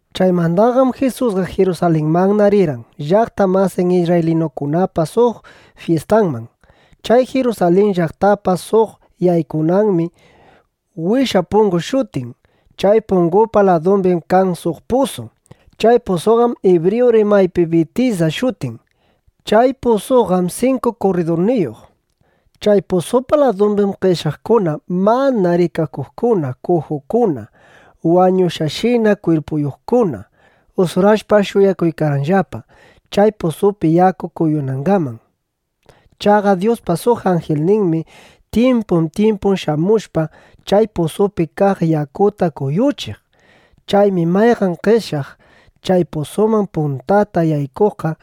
Chaymandaqam Jisusqa Jirusalinmanna rirqan, llaqta masin isrraylinukunapa suq fyistanman. Chay Jirusalin llaqtapa suq yaykunanmi “Wisha pungu” shutin. Chay pungupa ladumbim kan suq pusu. Chay pusuqam ibriyu rimaypiqa Bitisda shutin. Chay pusuqam sinku kurridurniyuq. Chay pusupa ladumbim qeshyaqkuna, mana rikakuqkuna, kujukuna, wañushqashina kwirpuyuqkuna, usurashpa ˻shuyakuykarqanllapa, chay pusupi yaku kuyunangaman. Chaqa Dyuspa suq anjilninmi tyimpun tyimpun shamushpa, chay pusupi kaq yakuta kuyuchiq. Chaymi mayqan qeshyaq chay pusuman puntata yaykuqqa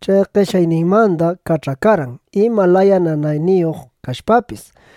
chay qeshyayninmanda kach'akarqan, ima laya nanayniyuq kashpapis.˼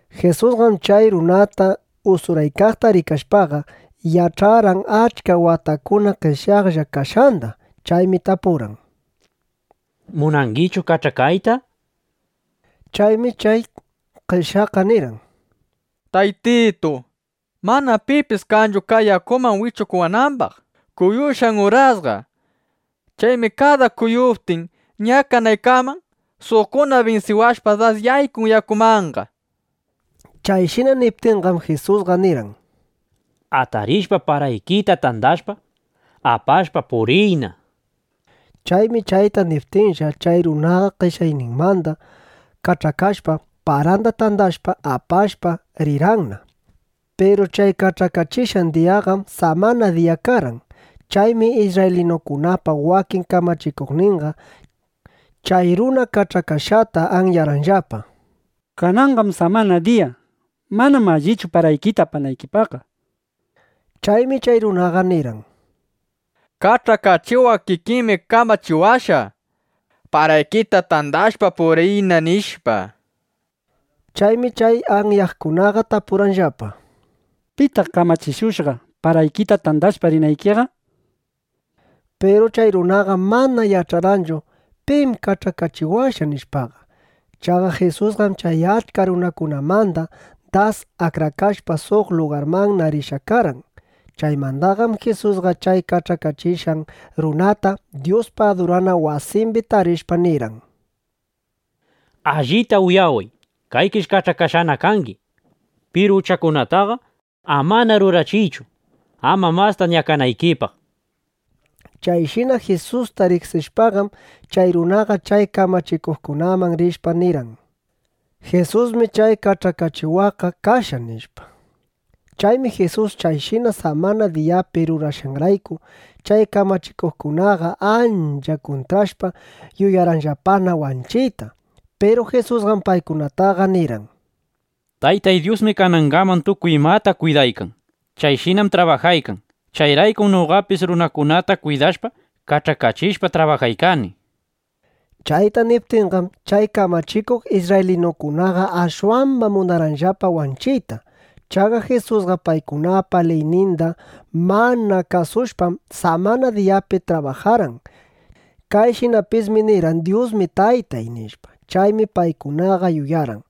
Jisusqam chay runata usuraykaqta rikashpaqa, yach'arqan achka watakunata qeshyaqlla kashqanda. Chaymi tapurqan: —¿Munangichu kach'akayta? nishpa. Chaymi chay qeshyaqqa nirqan: —Taytitu, manam pipis kanchu kay yakuman yaykuchiwanambaq kuyushqan urasqa. Chaymi kada kuyuptin, ñakanaykaman, suqkuna binsiwashpa, das yaykun yakumanqa, nishpa. Chayshina niptinqam, Jisusqa nirqan: —Atarishpa, paraykita tandashpa, apashpa, puriyna, nishpa. Chaymi chayta niptinlla, chay runaqa qeshyayninmanda kach'akashpa, paranda tandashpa, apashpa, rirqanna. Piru chay kach'akachishqan diyaqam samana diya karqan. Chaymi isrraylinukunapa wakin kamachikuqninqa chay runa kach'akashqata anyarqanllapa: —Kananqam samana diya. Manam allichu paraykita apanaykiqa, nishpa. Chaymi chay runaqa nirqan: —Kach'akachiwaq kikinmi kamachiwashqa: “Paraykita tandashpa puriyna”, nishpa. Chaymi chay anyaqkunaqa tapurqanllapa: —¿Pitaq kamachishushqa, paraykita tandashpa rinaykiqa? nishpa. Piru chay runaqam mana yach'arqanchu: Pim kach'akachiwashqa, nishpaqa. Chaqa Jisusqam chay achka runakunamanda das akrakashpa, suq lugarmanna rishqa karqan. Chaymandaqam Jisusqa chay kach'akachishqan runata Dyuspa adurana wasimbi tarishpa, nirqan: —Allita uyaway, kaykish kach'akashqana kangi. Piru uchakunataqa amana rurariychu, ama masta ñakanaykipaq, nishpa. Chayshina Jisusta riqsishpaqam, chay runaqa chay kamachikuqkunaman rishpa, nirqan: —Jisusmi chay kach'akachiwaqqa kashqa, nishpa. Chaymi Jisus chayshina samana diyapi rurashqanrayku, chay kamachikuqkunaqa ancha kuntrashpa, yuyarqanllapana wanchiyta. Piru Jisusqam paykunataqa nirqan: —Taytay Dyusmi kanangaman tukuy imata kwidaykan. Chayshinam trabajaykan. Chayraykum noqapis runakunata kwidashpa, kach'akachishpa trabajaykani, nishpa. Chayta niptinqam, chay kamachikuq isrraylinukunaqa ashwamba munarqanllapa wanchiyta. Chaqa Jisusqa paykunapa liyninda mana kasushpam, samana diyapi trabajarqan. Kayshinapismi nirqan: “Dyusmi Taytay”, nishpa. Chaymi paykunaqa yuyarqan: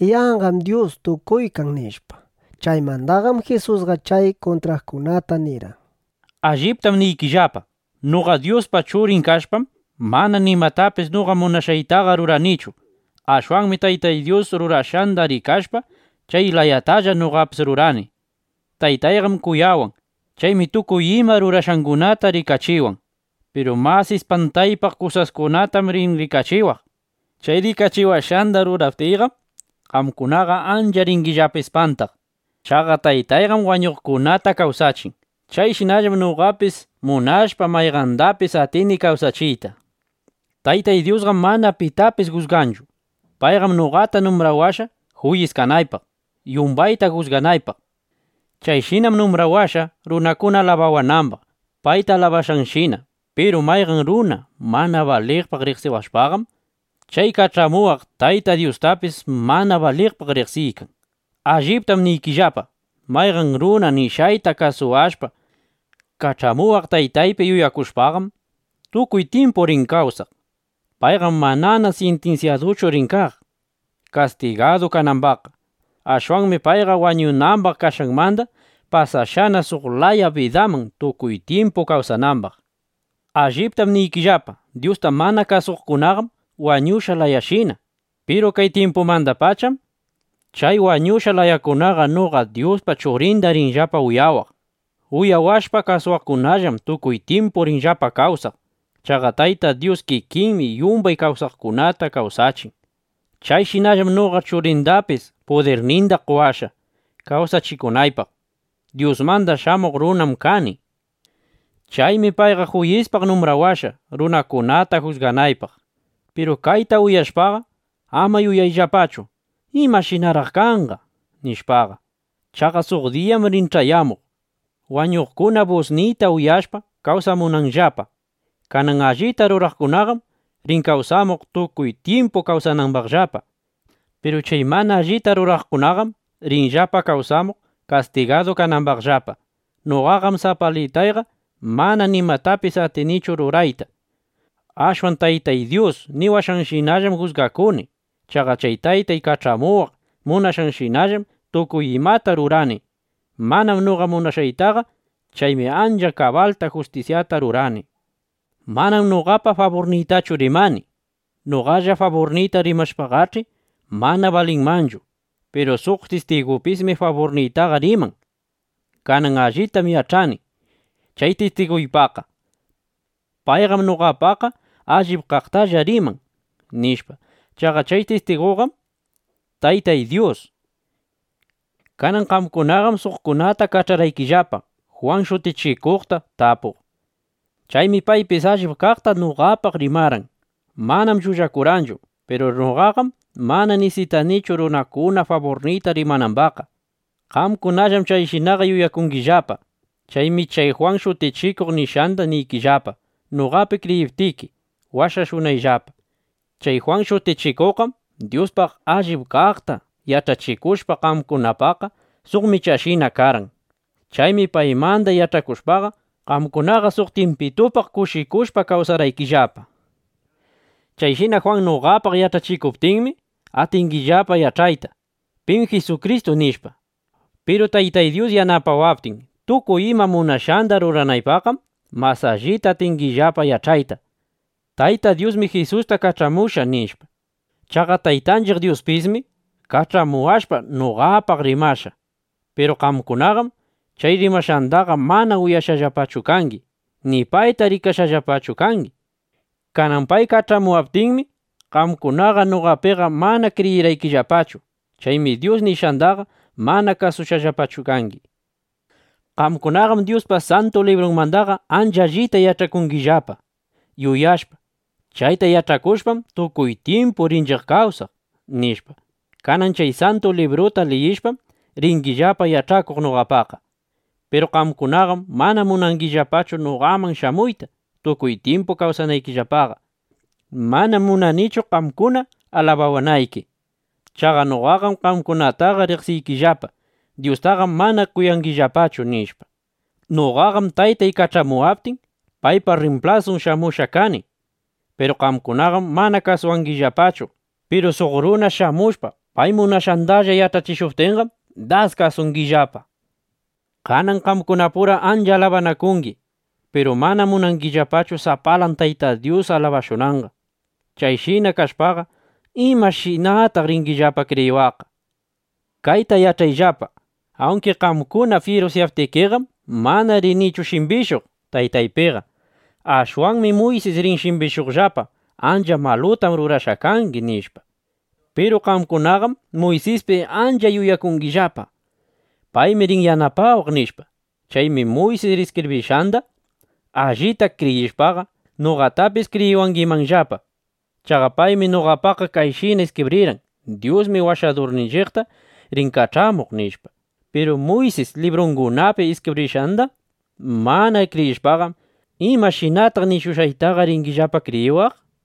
Yanqam Dyus tukuykan, nishpa. Chaymandaqam Jisusqa chay kuntraqkunata nirqan: —Alliptam niykillapa, noqa Dyuspa Churin kashpam, mana nimatapis noqa munashqaytaqa ruranichu. Ashwanmi Taytay rurashqanda rikashpa, chay layatalla noqapis rurani. Taytayqam kuyawan. Chaymi tukuy ima rurashqangunata rikachiwan. Piru mas ispantaypaq kusaskunatam rin rikachiwaq. Chay rikachiwashqanda ruraptiyqam, qamkunaqa ancha ringillapa ispantaq. Chaqa Taytayqam wañuqkunata kawsachin. Chayshinallam noqapis munashpa, mayqandapis atini kawsachiyta. Taytay Dyusqam mana pitapis jusganchu. Payqam noqata numbrawashqa juyis kanaypaq, yumbayta jusganaypaq. Chayshinam numbrawashqa, runakuna alabawanambaq, payta alabashqanshina. Piru mayqan runa mana baliqpaq riqsiwashpaqam, chay kach'amuwaq Tayta Dyustapis mana baliqpaq riqsiykan. ’Alliptam niykillapa, mayqan runa nishqayta kasuwashpa, kach'amuwaq Taytaypi yuyakushpaqam, tukuy tyimpu rin kawsaq. Payqam manana sintinsyaduchu rin kaq, kastigadu kanambaqqa. Ashwanmi payqa wañunambaq kashqanmanda pasashqana suq laya bidaman, tukuy tyimpu kawsanambaq. Alliptam niykillapa, Dyusta mana kasuqkunaqam wañushqa layashina. Piru kay tyimpumandapacham chay wañushqa layakunaqa noqa Dyuspa Churinda rinllapa uyawaq. Uyawashpa kasuwaqkunallam tukuy tyimpu rinllapa kawsaq. Chaqa Tayta Dyus kikinmi yumbay kawsaqkunata kawsachin. Chayshinallam noqa Churindapis pudirninda qowashqa, kawsachikunaypaq. Dyusmanda Shamuq Runam kani. Chaymi payqa juyispaq numbrawashqa, runakunata jusganaypaq. Piru kayta uyashpaqa, ama yuyayllapachu: ¿Imashinaraq kanqa? nishpaqa. Chaqa suq diyam rin ch'ayamuq, wañuqkuna busniyta uyashpa kawsamunanllapa. Kanan allita ruraqkunaqam rin kawsamuq, tukuy tyimpu kawsanambaqllapa. Piru chay mana allita ruraqkunaqam rinllapa kawsamuq, kastigadu kanambaqllapa. ’Noqaqam sapalitayqa mana nimatapis atinichu rurayta. Ashwan Taytay Dyus niwashqanshinallam jusgakuni. Chaqa chay Taytay kach'amuwaq munashqanshinallam tukuy imata rurani; manam noqa munashqaytaqa. Chaymi ancha kabalta justisyata rurani. Manam noqapa faburniytachu rimani. Noqalla faburniyta rimaptiyqach'i, mana balinmanchu. Piru suq tistigupismi faburniytaqa riman. Kanan allitam yach'ani chay tistugupaqqa. Payqam noqapaqqa allip kaqtalla riman, nishpa. (Chaqa chay tistiguqam Taytay Dyus.) Kanan qamkunaqam suqkunata kach'arqaykillapa, Jwan Shutichikuqta tapuq. Chaymi paypis allip kaqta noqapaq rimarqan. Manam llullakurqanchu. Piru noqaqam mana nisitanichu, runakuna faburniyta rimanambaqqa. Qamkunallam chayshinaqa yuyangillapa. Chaymi chay Jwan Shutichikuq nishqanda niykillapa, noqapi kriyiptiki, washashunayllapa. Chay Jwan Shutichikuqqam Dyuspaq allip kaqta yach'achishushpa, qamkunapaqqa suq michashina karqan. Chaymi paymanda yach'akushpaqa, qamkunaqa suq tyimpitupaq kushikushpa kawsarqaykillapa. ’Chayshina Jwan noqapaq yach'achikuptinmi, atingillapa yach'ayta: Pim Jisukristu, nishpa. Piru Taytay Dyus yanapawaptin tukuy ima munashqanda ruranaypaqqam, mas allita atingillapa yach'ayta: Tayta Dyusmi Jisusta kach'amushqa, nishpa. Chaqa Taytanchiq Dyuspismi kach'amuwashpa, noqapaq rimashqa. Piru qamkunaqam chay rimashqandaqa mana uyashqallapachu kangi, ni payta rikashqallapachu kangi. Kanan pay kach'amuwaptinmi, qamkunaqa noqapiqa mana kriyirqaykillapachu. Chaymi Dyus nishqandaqa mana kasushqallapachu kangi. Qamkunaqam Dyuspa Santu Librunmandaqa ancha allita yach'akungillapa, yuyashpa: Chayta yach'akushpam, tukuy tyimpu rinchiq kawsaq, nishpa. Kanan chay Santu Libruta liyishpam, ringillapa yach'akuq noqapaqqa. Piru qamkunaqam mana munangillapachu noqaman shamuyta, tukuy tyimpu kawsanaykillapaqa. ’Manam munanichu, qamkuna alabawanayki. Chaqa noqaqam qamkunataqa riqsiykillapa: Dyustaqam mana kuyangillapachu, nishpa. Noqaqam, Taytay kach'amuwaptin, paypa rrimplasun shamushqa kani. Piru qamkunaqam mana kasuwangillapachu. Piru suq runa shamushpa, pay munashqandalla yach'achishuptinqam, das kasungillapa. Kanan qamkunapura ancha alabanakungi. Piru manam munangillapachu sapalan Tayta Dyus alabashunanqa. Chayshina kashpaqa, ¿imashinataq ringillapa kriyiwaqqa? Kayta yach'ayllapa: Awnki qamkuna fyirusyawaptikiqam, mana rinichu shimbishuq Taytaypiqa. Ashwanmi Muysis rin shimbishuqllapa: “Ancha malutam rurashqa kangi”, nishpa. Piru qamkunaqam Muysispi ancha yuyakungillapa: Paymi rin yanapawaq, nishpa. Chaymi Muysis iskibrishqanda allipta kriyishpaqa, noqatapis kriyiwangimanllapa. Chaqa paymi noqapaqqa kayshina iskibrirqan: “Dyusmi Washadurninchiqta rin kach'amuq”, nishpa. Piru Muysis librungunapi iskibrishqanda mana kriyishpaqam, ¿imashinataq nishushqaytaqa ringillapa kriyiwaq? nishpa.